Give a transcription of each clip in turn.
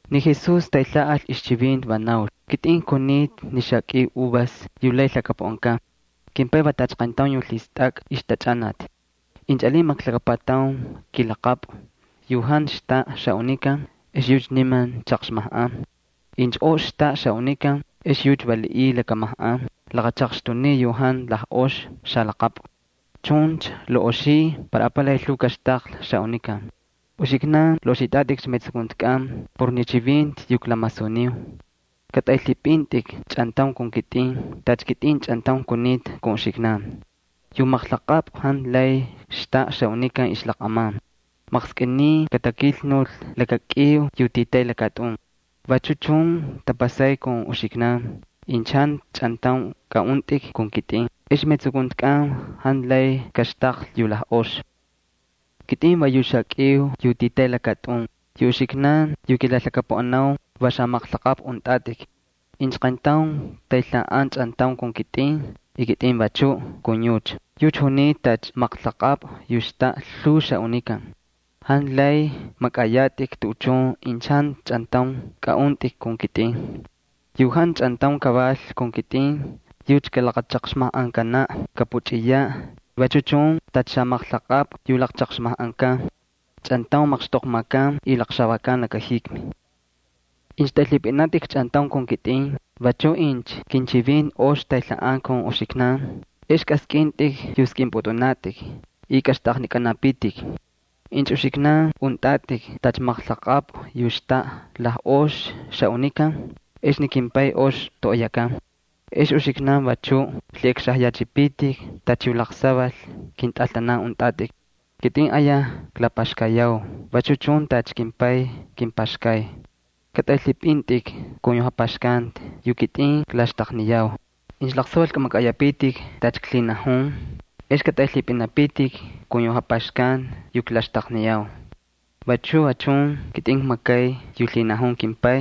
Ni Jesús taylhaꞌal ixchivinti, va naul: —Kitꞌin kunita ni xakꞌiu uvas yu lay lhakapuꞌankan. KimPay va tacha qayntaun yu lhistakꞌa ixjatachꞌanati. Incha alin maqlakapataun kimaqlaqapꞌu yu jantu xtaꞌa xaꞌunikan ex yucha niman chaqxmajꞌan. Incha ox xtaꞌa xaꞌunikan, ex yucha valiꞌiy lakamajꞌan laqachaqxtuniy yu jantu lajꞌox xalaqapꞌu. Chuncha laꞌoxiy para apalay lhuu kaxtaqlhi xaꞌunikan. Uxiknan laꞌoxitꞌatꞌikcha metsukuntikꞌan por ni chivinti yu klamasuniu. Katꞌaylhipꞌintꞌik chꞌantaun kun kitꞌin, tacha kitꞌin chꞌantaun kunita kun uxiknan. Yu maqlaqapꞌu jantu lay xtaꞌa xaꞌunikan ixlaqꞌaman, maqskꞌiniy katakilnul laka kꞌiu yu titay lakatꞌun. Vachu chun tapasay kun uxiknan, incha jantu chꞌantaun kaꞌuntꞌik kun kitꞌin ex metsukuntikꞌan jantu lay kaxtaqlhi yu lajꞌoxi. ’Kitꞌin va yu xakꞌiu yu titay lakatꞌun, yu uxiknan yu kilalhakapuꞌanau, va xamaqlaqapꞌu untꞌatꞌik. Incha qayntaun taylhaꞌan chꞌantaun kun kitꞌin y kitꞌin vachuꞌ kun yucha, yucha junita tacha maqlaqapꞌu yu xtaꞌa lhuu xaꞌunikan. Jantu lay makꞌayatꞌik tuꞌuchun incha jantu chꞌantaun kaꞌuntꞌik kun kitꞌin. Yu jantu chꞌantaun kaval kun kitꞌin, yucha kalaqchaqxmajꞌankanaꞌ, kapuchꞌiyaꞌ vachu chun tacha xamaqlaqapꞌu yu laqchaqxmajꞌankan. Chꞌantaun maqxtoqmakan y laqxavakan laka jikmi. ’Incha tꞌaylhipꞌinatꞌik chꞌantaun kun kitꞌin, vachu incha kinchivinti ox taylhaꞌan kun uxiknankꞌan, ex kꞌaskꞌintꞌik yu skꞌinpꞌutꞌunatꞌik y kꞌaxtꞌaqnikꞌanapitik. Incha uxiknan untꞌatꞌik tacha maqlaqapꞌu yu xtaꞌa lajꞌox xaꞌunikan ex ni kimPay ox toꞌoyakan. Ex uxiknan vachuꞌ lhiꞌakxajyachꞌipitik tacha yu laqsaval kintꞌaltanan untꞌatꞌik. Kitꞌin ayaj klapaxkayau vachu chun tacha kimPay kimpaxkay. Katꞌaylhipꞌintꞌik kun yu japaxkanti yu kitꞌin klaxtaqniyau. Incha laqsaval kꞌamakꞌayapitik tacha klhinajun, ex katꞌaylhipꞌinapitik kun yu japaxkanti yu klaxtaqniyau. Vachu va chun kitꞌin kmakay yu lhinajun kimPay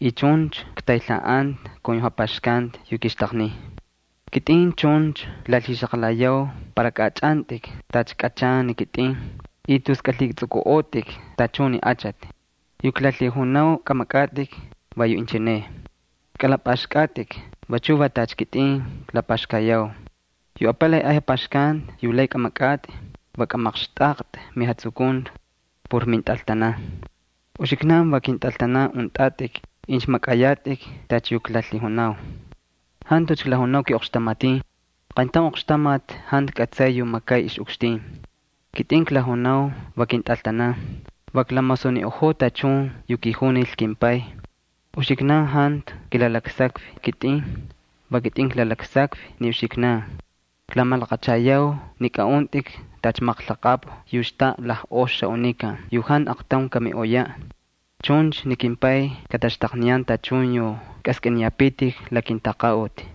y chuncha ktaylhaꞌanta kun yu japaxkanti yu kixtaqniy. ’Kitꞌin chuncha klalhixaqalayau para kaꞌachꞌantꞌik tacha kꞌachan ni kitꞌin y tus kꞌalhitsꞌukꞌuꞌotꞌik tachun ni achati. Yu klalhijunau kꞌamakꞌatꞌik va yu inchineꞌ: Kꞌalapꞌaxkꞌatꞌik vachu va tacha ni kitꞌin klapaxkayau. Yu apalay ay japaxkanti yu lay kꞌamakꞌatꞌi va kꞌamaqxtꞌaqtꞌi mijatsukunti por mintꞌaltanan. Uxiknan va kintꞌaltanan untꞌatꞌik incha makꞌayatꞌik tacha yu klalhijunau. Jantucha klajunau kiꞌoqxtamatin. Qayntaun oqxtamati jantu kꞌatsay yu makay ixꞌukxtin. Kitꞌin klajunau va kintꞌaltanan, va klamasuniꞌojoo tachun yu kijunil kimPay. Uxiknan jantu kilalaksakvi kitꞌin, va kitꞌin klalaksakvi ni uxiknan. Klamalaqachayau ni kaꞌuntꞌik tacha maqlaqapꞌu yu xtaꞌa lajꞌox xaꞌunikan yu jantu aqtaun kamiꞌoyaꞌ. Chuncha ni kimPay kataxtaqniyan tachun yu kꞌaskꞌiniyapitik la kintaqaꞌuti.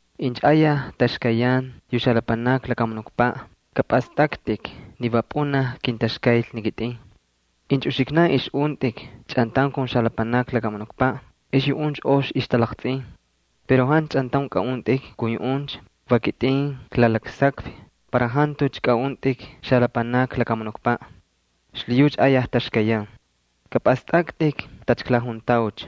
—Incha ayaj taxkayyan yu xalapanakni lakamunukpaꞌ, kapꞌastꞌaktꞌik ni va pꞌunaj kintaxkayl ni kitꞌin. Incha uxiknan ixꞌuntꞌik chꞌantaun kun xalapanakni lakamunukpaꞌ ex yuꞌuncha ox ixtalaqtsꞌin. Pero jantu chꞌantaun kaꞌuntꞌik kun yuꞌuncha, va kitꞌin klalaksakvi para jantucha kaꞌuntꞌik xalapanakni lakamunukpaꞌ. Xlhiyucha ayaj taxkayyan. Kapꞌastꞌaktꞌik tacha klajuntaucha: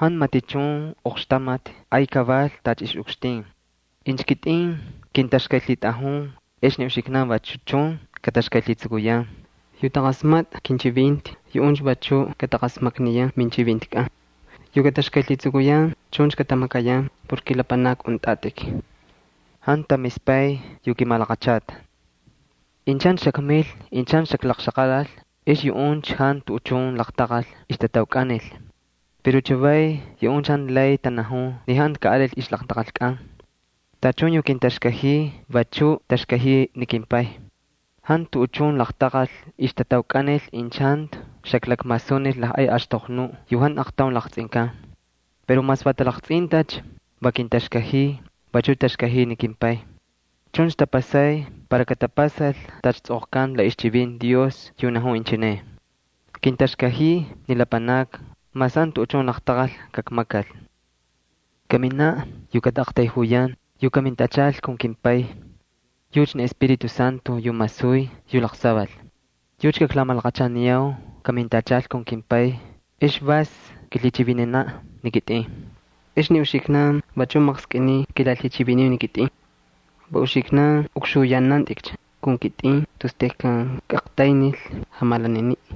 “Jantu matichun oqxtamati ay kaval tacha ixꞌukxtin.” Incha kitꞌin kintaxkaylhitꞌajun, ex ni uxiknan vachu chun kataxkaylhitsukuyan. Yu taqasmatꞌa kinchivinti, yuꞌuncha vachu kataqasmakniyan minchivintikꞌan. Yu kataxkaylhitsukuyan chuncha katamakayan por kilapanakni untꞌatꞌik. Jantu tamispay yu kimalaqachata. ’Incha jantu xakmil, incha jantu xaklaqlhixaqalal ex yuꞌuncha jantu tuꞌuchun laqtaqal ixtataukꞌanil. Pero chavay yuꞌuncha jantu lay tanajun ni jantu kaꞌalil ixlaqtaqalkꞌan. Tachun yu kintaxkajiy vachu taxkajiy ni kimPay. Jantu tuꞌuchun laqtaqal ixtataukꞌanil incha jantu xaklakmasunil lajꞌay axtoqnuꞌ yu jantu aqtaun laqtsꞌinkan. Pero mas va talaqtsꞌintacha va kintaxkajiy, vachuꞌ taxkajiy ni kimPay. Chuncha tapasay para katapasal tacha tsꞌoqkanta la ixchivinti Dios yu najun inchineꞌ: “Kintaxkajiy ni lapanakni mas jantu tuꞌuchun laqtaqal kakmakal.” ’Kaminaꞌ yu kataꞌaqtayjuyan yu kamintachal kun kimPay. Yucha ni Espíritu Santo yu masuy yu laqsaval. Yucha kaklamalaqachaniyau kamintachal kun kimPay ex vas kilhichivinanaꞌ ni kitꞌin. Ex ni uxiknan vachuꞌ maqskꞌiniy kilalhichiviniu ni kitꞌin. Va uxiknan ukxuyanantꞌikcha kun kitꞌin tus tejkan kꞌaqtaynil jamalaniniꞌ.